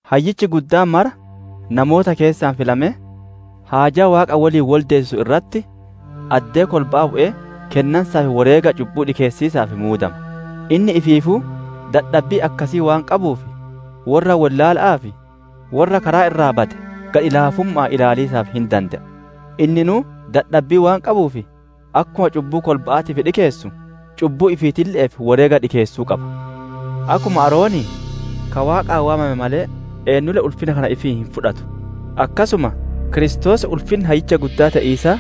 Hayyichi guddaan mara namoota keessaa filamee, haajaa Waaqa woliin woldeessisu irratti addee kolba'aa bu'ee kennansaa fi woreega cubbu'uu dhikeessiisaaf muudama. Inni ifiifuu dadhabbii akkasii waan qabuuf, worra wollaala'aa fi worra karaa irraa bade gadhi-laafumma'aan ilaaliisaaf hin dande'a. Inninuu dadhabbii waan qabuuf, akkuma cubbuu kolba'aatiif dhikeessu, cubbuu ifiitille'eef woreega dhikeessuu qaba. Akkuma Aaronii ka Waaqaan waamame malee, eennulle ulfinna kana ifiin hin fudhatu. Akkasuma Kiristoos ulfinna Hayyicha Guddaa te'iisaa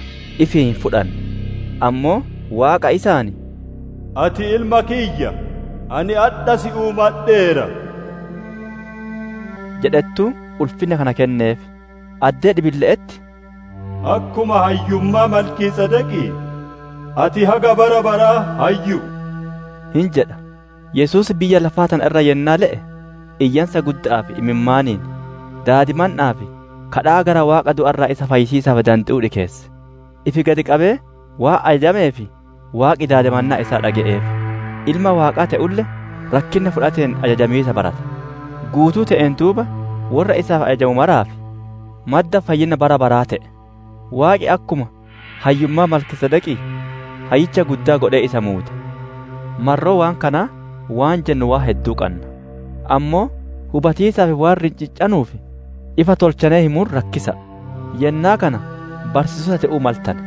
ifiin hin fudhanne; ammoo Waaqa isaan, «Ati Ilma kiyya, ani adha si uumadheera!» jedhettuu ulfinna kana kenneef. Addee dhibiille'etti, «Akkuma hayyummaa, Malkiisedeqii, ati haga bara baraa hayyu'u» hin jedha. Yesuus biyya lafaa tana irra yennaa le'e, iyyansa gudda'aa fi imimmaaniin, daadimanna'aa fi gaaffii gara Waaqa du'a irraa isa fayyisiisaaf dande'uu dhikeesse; ifi gadi qabee waan ajajameef Waaqi daadimannaa isaa dhage'eef. Ilma Waaqaa te'ulle, rakkinna fudhateen ajajamiisa barate. Guutuu te'een duuba worra isaaf ajajamu maraaf madda fayyinna bara baraa te'e. Waaqi akkuma hayyummaa Malkiisedeqii, Hayyicha Guddaa godhee isa muude. Marroo waan kanaa waan jennu waan hedduu qanna; ammoo hubatiisaaf waan rinciccanuuf, ifa tolchanee himuun rakkisa'a. Yennaa kana barsiisota te'uu maltane;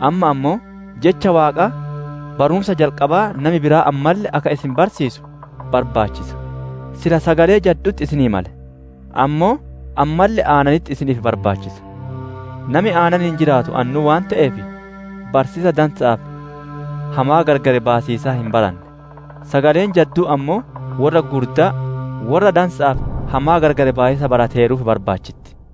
amma ammoo jecha Waaqaa barumsa jalqabaa nami biraa ammalle akka isin barsiisu barbaachisa; silaa sagalee jaddu'utti isinii male; ammoo ammalle aananitti isiniif barbaachisa. Nami aananiin jiraatu annuu waan te'eef, barsiisa dansa'aa fi hamaa gargar baasiisaa hin baranne. Sagaleen jadduun ammoo worra gugurdaa, worra dansa'aa fi hamaa gargar baasiisa barateeruuf barbaachitti.